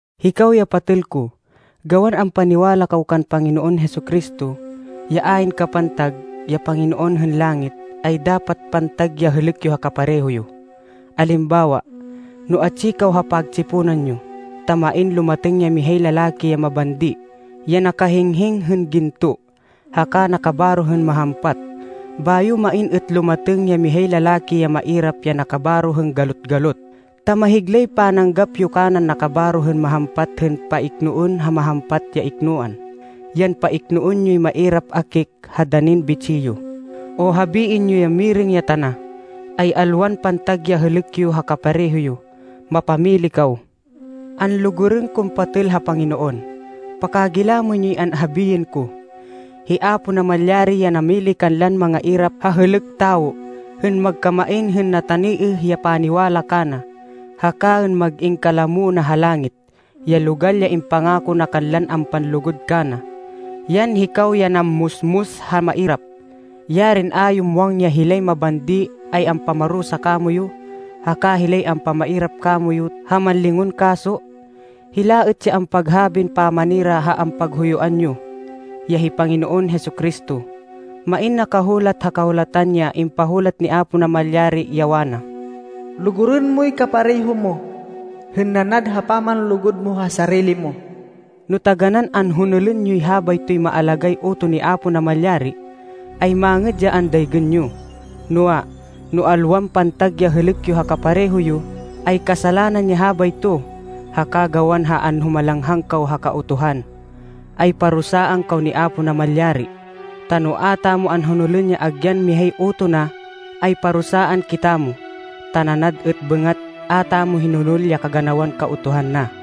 Hikaw ya patêl ko, gawan ampaniwala kaw kan Panginoon Jesu-Cristo, ya ayn kapantag, ya Panginoon hên langit, ay dapat pantag ya hêlêk yo ha kapareho yo. Alimbawa, no atsi kaw ha pagtsiponan yo, ta main lumatêng ya mihay lalaki ya mabandi, ya nakahinghing hên ginto, haka nakabaro hên mahampat, bayo main êt lumatêng ya mihay lalaki ya mairap ya nakabaro hên galot-galot, ta mahiglay pananggap yo kanan nakabaro hên mahampat hên paiknoên ha mahampat ya iknoan, yan paiknoên yoy mairap akik ha danin bitsih yo, o habiên yo ya mirêng ya tana, ay alwan pantag ya hêlêk yo ha kapareho yo. Mapamili kaw! Anlugurên kon patêl ha Panginoon, pakagilamên yoy anhabiên ko. Hi Apo Namalyari ya namili kanlan mangairap ha hêlêk tawo, hên magkamain hên nataniêh ya paniwala kana, haka hên mag-in kalamo na ha langit, ya logal ya impangako na kanlan ampanlugud kana. Yan hikaw ya nammusmus ha mairap. Yarin a yo muwang ya hilay mabandi ay ampamarusa kamoyu, haka hilay ampamiarap kamoyu ha mánlingon kaso! Hila êt ya ampaghabin pamanira ha ampaghuyuan yo, ya hi Panginoon Jesu-Cristo. Main nakahulat ha Kahulatan ya impahulat ni Apo Namalyari ya wana, “Lugurên moy kapareho mo hên nanad ha pamanlugud mo ha sarili mo.” No taganán anhonolên yoy habaytoy maalagáy utoh ni Apo Namalyari, ay mangêd ya andaygên yo. Noa, no alwan pantag ya hêlêk yo ha kapareho yo, ay kasalanan ya habayto, haka gawan ha anhumalanghang kaw ha Kautuhan, ay parusaan kaw ni Apo Namalyari. Ta no a tamo anhonolên ya agyan mihay utoh na, ay parusaan kitamo, ta nanad êt bêngat a tamo hinonol ya kaganawan Kautuhan na.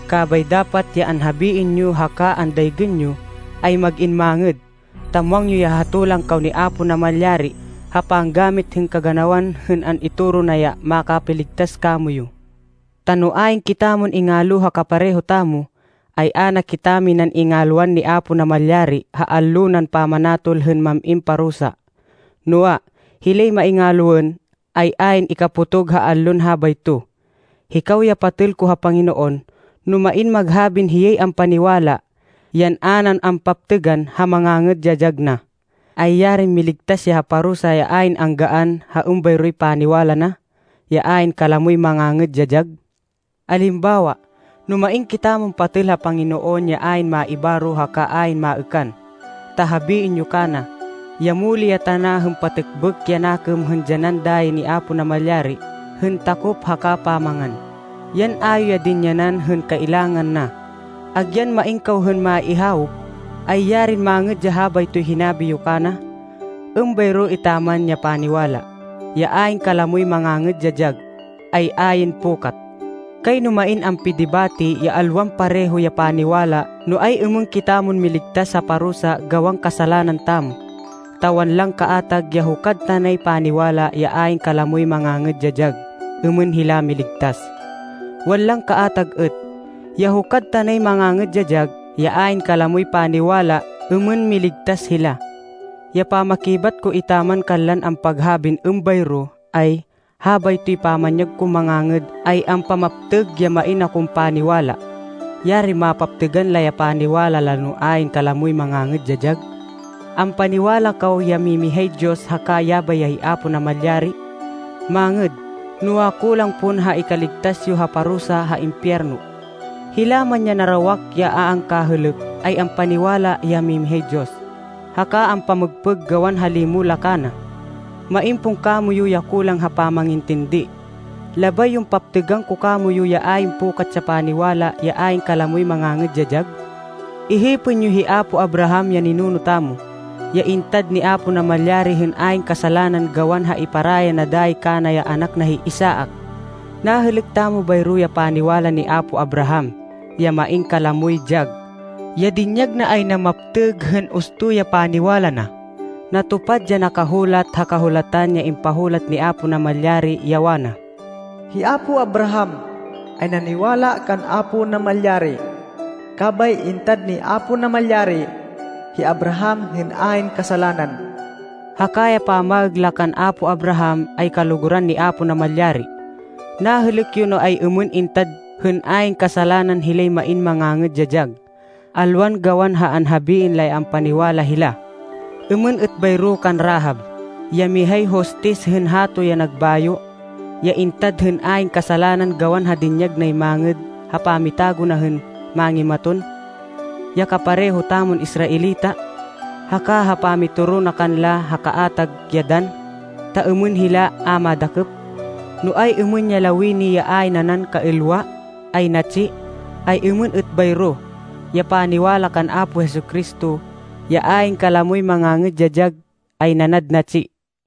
Kabay dapat ya anhabiên yo haka ya andaygên yo, ay mag-in mangêd, ta muwang yo ya hatolan kaw ni Apo Namalyari ha panggamit hên kaganawan hên an-itoro na ya makapiligtas kamoyu. Ta no ayn kitamon ingalo ha kapareho tamo, ay a na kitaminan ingalwan ni Apo Namalyari ha allo nan pamanatol hên mam-in parusa. Noa, hilay maingaloên, ay ayn ikapotog ha allon habayto. Hikaw ya patêl ko ha Panginoon, no main maghabin hiyay ampaniwala, yan a nan ampaptêgan ha mangangêd ya dyag na, ay yarin miligtas ya ha parusa ya ayn anggaan ha êmbayroy paniwala na, ya ayn kalamoy mangangêd ya dyag! Alimbawa, no main kitamon patêl ha Panginoon ya ayn maibaro haka ayn maêkan, ta habiên yo kana, ya muli ya tana hên patêkbêk ya nakêm hên dyanan ya dayi ni Apo Namalyari hên takop haka pamangan, yan a yo yan dinyanan hên kailangan na, agyan main kaw hên maihawop, ay yarin mangêd ya habaytoy hinabi yo kana! Êmbayro etaman ya paniwala, ya ayn kalamoy mangangêd ya dyag, ay ayn pukat. Kayno main ampidibate ya alwan pareho ya paniwala no ay-êmên kitamon miligtas ha parusa gawan kasalanan tamo. Ta wanlan kaatag ya hukad tanay paniwala ya ayn kalamoy mangangêd ya dyag êmên hila miligtas. Wanlan kaatag êt, ya hukad tanay mangangêd ya dyag ya ayn kalamoy paniwala êmên miligtas hila. Ya pamakibat ko etaman kanlan ampaghabin êmbayro ay, habaytoy pamanyag kon mangangêd ay ampamaptêg ya main akon paniwala. Yarin mapaptêgan la ya paniwala la no ayn kalamoy mangangêd ya dyag! Ampaniwala kaw ya mimihay Diyos haka yabay ya hi Apo Namalyari. Mangêd, noa, kulang pon ha ikaligtas yo ha parusa ha impiyerno! Hila man ya narawak ya a angkahêlêk ay ampaniwala ya mimihay Diyos, haka ampamêgpêg gawan ha limo la kana. Main pon kamoyu ya kulang ha pamangintindi? Labay yon paptêgan ko kamoyu ya ayn pukat ya paniwala ya ayn kalamoy mangangêd ya dyag! Ihipên yo hi apo Abraham ya ninuno tamo, ya intad ni Apo Namalyari hên ayn kasalanan gawan ha iparaya na dayi kana ya anak na hi Isaac. Nahêlêk tamo bayro ya paniwala ni apo Abraham, ya main kalamoy dyag. Ya dinyag na ay namaptêg hên usto ya paniwala na. Natupad ya nakahulat ha Kahulatan ya impahulat ni Apo Namalyari, ya wana, “Hi apo Abraham ay naniwala kan Apo Namalyari. Kabay intad ni Apo Namalyari hi Abraham hên ayn kasalanan.” Haka ya pamaêg la kan apo Abraham ay kaluguran ni Apo Namalyari. Nahêlêk yo no ay-êmên intad hên ayn kasalanan hilay main mangangêd ya dyag, alwan gawan ha anhabiên la ya ampaniwala hila. Êmên êt bayro kan Rahab, ya mihay hostis hên hato ya nagbayo, ya intad hên ayn kasalanan gawan ha dinyag nay mangêd ha pamitago na hên mángimaton, ya kapareho tamon Israelita, haka ha pamitoro na kanla ha kaatag ya dann, ta êmên hila a madakêp. No ay-êmên ya lawini ya ayn nanan kaêlwa, ay natsi, ay êmên êt bayro, ya paniwala kan Apo Jesu-Cristo, ya ayn kalamoy mangangêd ya dyag, ay nanad natsi.